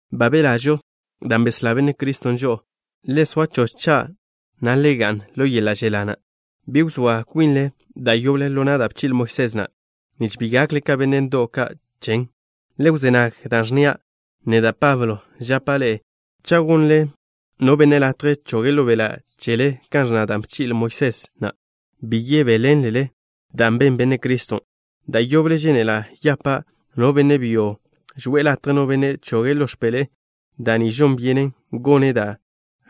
Ba belažo dan' beslá Benne' Criston' žo'o. Le soa choch cha', na' le ga'n ḻo yeḻa' želá na'. Bi wzóa kwinle da' yoble ḻo na' da' bchi'le Moisés na', nich bi gakle ka benne' ndo'w ka' chen. Le wzé nag da' ẕnnia'. Neda', Pablo, žapa' ḻe'e cha' gonnle no benne' latje choge' ḻo beḻa' chele kan ẕnna da' bchi'le Moisés na', bi yebéḻenlele da' ben Benne' Criston'. Da' yoble žénela' yapa' no benne' byo žwe'e latje no benne' choge' ḻo x̱peḻe'e da' ni, žon byenen gone' dot da'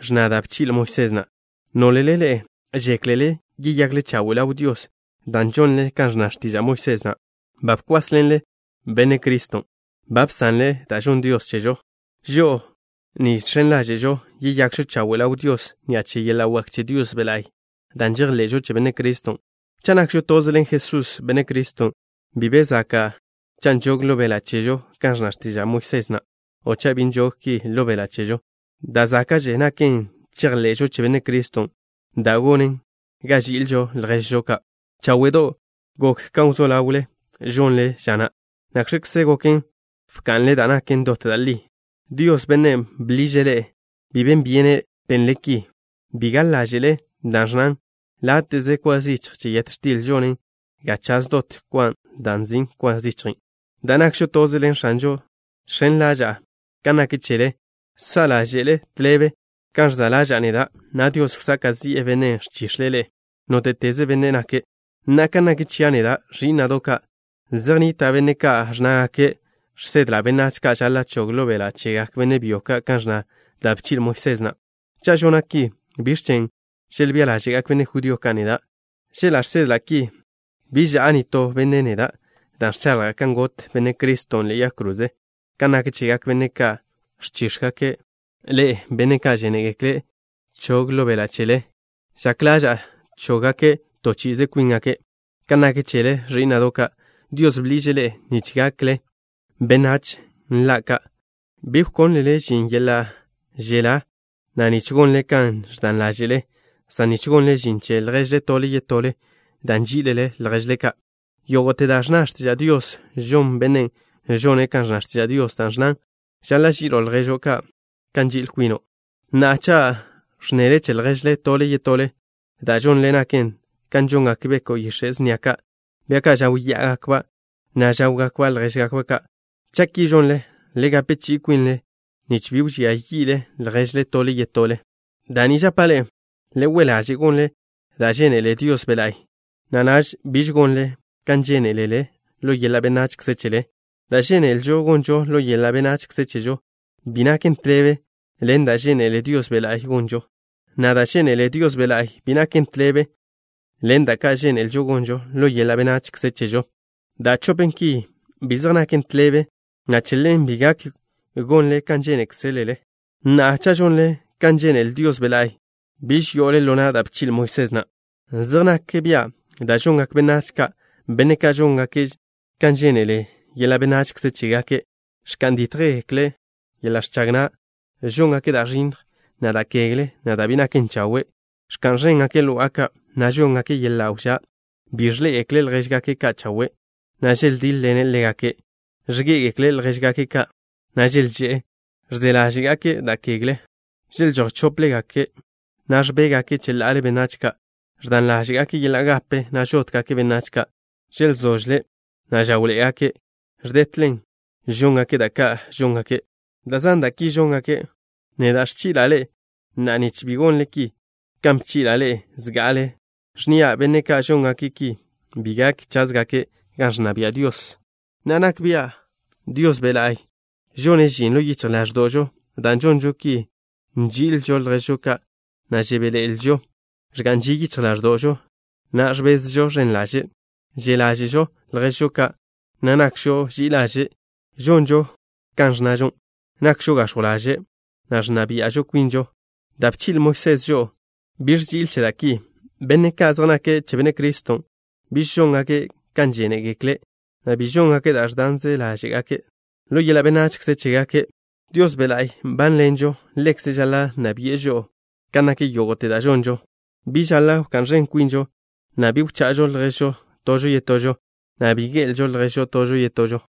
ẕnna da' bchi'le Moisés na'. Nólele ḻe'e žéklele yeyakle chawe' ḻaw Dios dan' žonle kan ẕnna x̱tiža' Moisés na', ba bkwásḻenle Benne' Criston'. Ba bsanle da' žonn Dios chežo. Žo'o ni žx̱en ḻáže'žo yeyakžo chawe' ḻaw Dios ni'a che yeḻa' wak che Dios Be' La'y dan' žejḻe'žo che Benne' Criston'. Cha' nakžo toze ḻen Jesús, Benne' Criston', bi be zaka' cha' nžog ḻo beḻa' chežo kan ẕnna x̱tiža' Moisés na', o cha' bi nžog ki ḻo beḻa' chežo. Da' záka'že naken chejḻe'žo che Benne' Criston', da' gonen ga ži'ilžo lježžo ka'. Cháwe'do' gok kan wzó ḻawle žonle ža na'. ¿Nakx̱kze goken bka'nle da' naken dot da' li? Dios, Bennen' bḻiže' ḻe'e, bi ben byene' benle ki. Bi gaḻ ḻáže'le da' ẕnnan: “Láte'ze kwa zichj che yet x̱til žonen ga chaž dot kwa da' nzin' kwa zichjen'.” Dan' nakžo toze ḻen X̱anžon', žx̱en ḻaža'a kan nak chele, sa' ḻáže'le tḻebe kan ẕza' ḻaža'a neda', na' Dios wsaka' zi'e bennen' ẕchix̱e' ḻe'e, nóte'teze benne' nake'. Na'a, kan nak chia' neda', ẕí'na'do' ka', zej nnita' benne' ka' ẕnnágake' žsedla' benách ka' žaḻa' chog ḻo beḻa' chegak benne' byo ka' kan ẕnna da' bchi'le Moisés na'. Cha' žona' ki, ¿biẕ chen' želbía ḻáže'gak benne' judío ka' neda'? Chela' žsedla' ki, bi ža'a nitó benne' neda' dan' ẕchaḻja' kan got Benne' Criston' ḻe'e yag kroze. Kan nak chegak benne' ka' ẕchíx̱gake' ḻe'e, benne' ka' žénegekle' chog ḻo beḻa' chele, žak ḻaža'a chóggake' to chi'ize kwíngake'. Kan nak chele, ẕí'na'do' ka', Dios bḻiže' ḻe'e nich gakle benách nla ka'. Bi wkónlele žin yeḻa' želá na' nich gonle kan ẕdan ḻáže'zele, san nich gonle žin che lježle tole yetole, dan' nží'ilele lježle ka'. Yógo'te da' ẕnna x̱tiža' Dios žon bennen' žone' kan ẕnna x̱tiža' Dios da' ẕnnan: “Žaḻa' ži'ilo' lježo' kan nži'il kwino'.” Na'a, cha' ẕnnele che lježle tole yetole, da' žonle naken kan žongak beko' yix̱e' snia ka', bia ka' žáwya'agakba', na' žáwgakba' ljéžgakba' ka'. Cha' ki žonle, le gape chi'i kwinle nich bi wžía yi'le lježle tole yetole. Da' ni žapa' ḻe'e: le we' laže' gonle da' žénele Dios Be' La'y, na' naž biž gonle kan žénelele ḻo yeḻa' benachze chele. Da' žénelžo gonžo ḻo yeḻa' benachze chežo bi naken tḻebe ḻen da' žénele Dios Be' La'y gonžon, na' da' žénele Dios Be' La'y bi naken tḻebe ḻen da' ka' žénelžo gonžo ḻo yeḻa' benachze chežo. Da' chopen ki, bi zej naken tḻebe, na' che ḻen bi gak gonle kan žénekzelele. Na'a, cha' žonle kan žénele Dios Be' La'y, biž yo'ole ḻo na' da' bchi'le Moisés na'. Zej nak bia' da' žongak benách ka', benne' ka' žóngake' kan žénele yeḻa' benachze chégake': Ẕka'n dítjgake' yeḻa' ẕchag na'. Žóngake' da' ẕinnj, na' da' kegle, na' da' bi naken chawe'. Ẕka'n ẕéngake' lo'a ka', na' žóngake' yeḻa' wžá'. Bi ẕḻé'egekle' ljéžgake' ka' chawe', na' želdíḻ-ḻene' ḻégake'. Ẕgé'egekle' ljéžgake' ka', na' želžé'e. Ẕze ḻáže'gake' da' kegle. Želžój chóplegake', na' ẕbéjgake' cheḻa'ale benách ka'. Ẕdan ḻáže'gake' yeḻa' gape, na' žótgake' benách ka'. Želzožle', na' žáwḻe'egake'. Ẕdetlen žóngake' da' ka' žóngake'. Da' zan da' ki žóngake'. Neda' ẕchi'la' ḻe'e na'a nich bi gonle ki, kan bchi'la' ḻe'e zga'ale, ẕnnia': benne' ka' žóngake' ki bi gak cházgake' gan ẕnna bia' Dios. Na'a, nak bia' Dios Be' La'y žone' žin ḻo yichj ḻáẕdo'žo dan' žonžo ki: Nži'ilžo lježžo ka', na' žebéḻe'elžo. Ẕga'n ži yichj ḻáẕdo'žo, na' ẕbezžo ẕen ḻaže'. Že' ḻáže'žo lježžo ka', na' nakžo ži'i ḻaže'. Žonžo kan ẕnnažo. Nakžo gax̱jw ḻaže', na' ẕnna bia'žo kwinžo. Da' bchi'le Moisés žo'o bi ẕži'il che da' ki. Benne' ka' zej nake' che Benne' Criston' biž žóngake' kan žénekzegekle', na' bi žóngake' da' ẕdanze ḻáže'gake' ḻo yeḻa' benachze chégake'. Dios Be' La'y nbánḻenžo. Ḻekze' žaḻa' nna bi'e žo'o kan nak yógo'te da' žonžo. Bi žaḻa' wká'n ẕen kwinžo, na' bi wcha'žo lježžo tožo yetožo, na' bi ge'elžo lježžo tožo yetožo.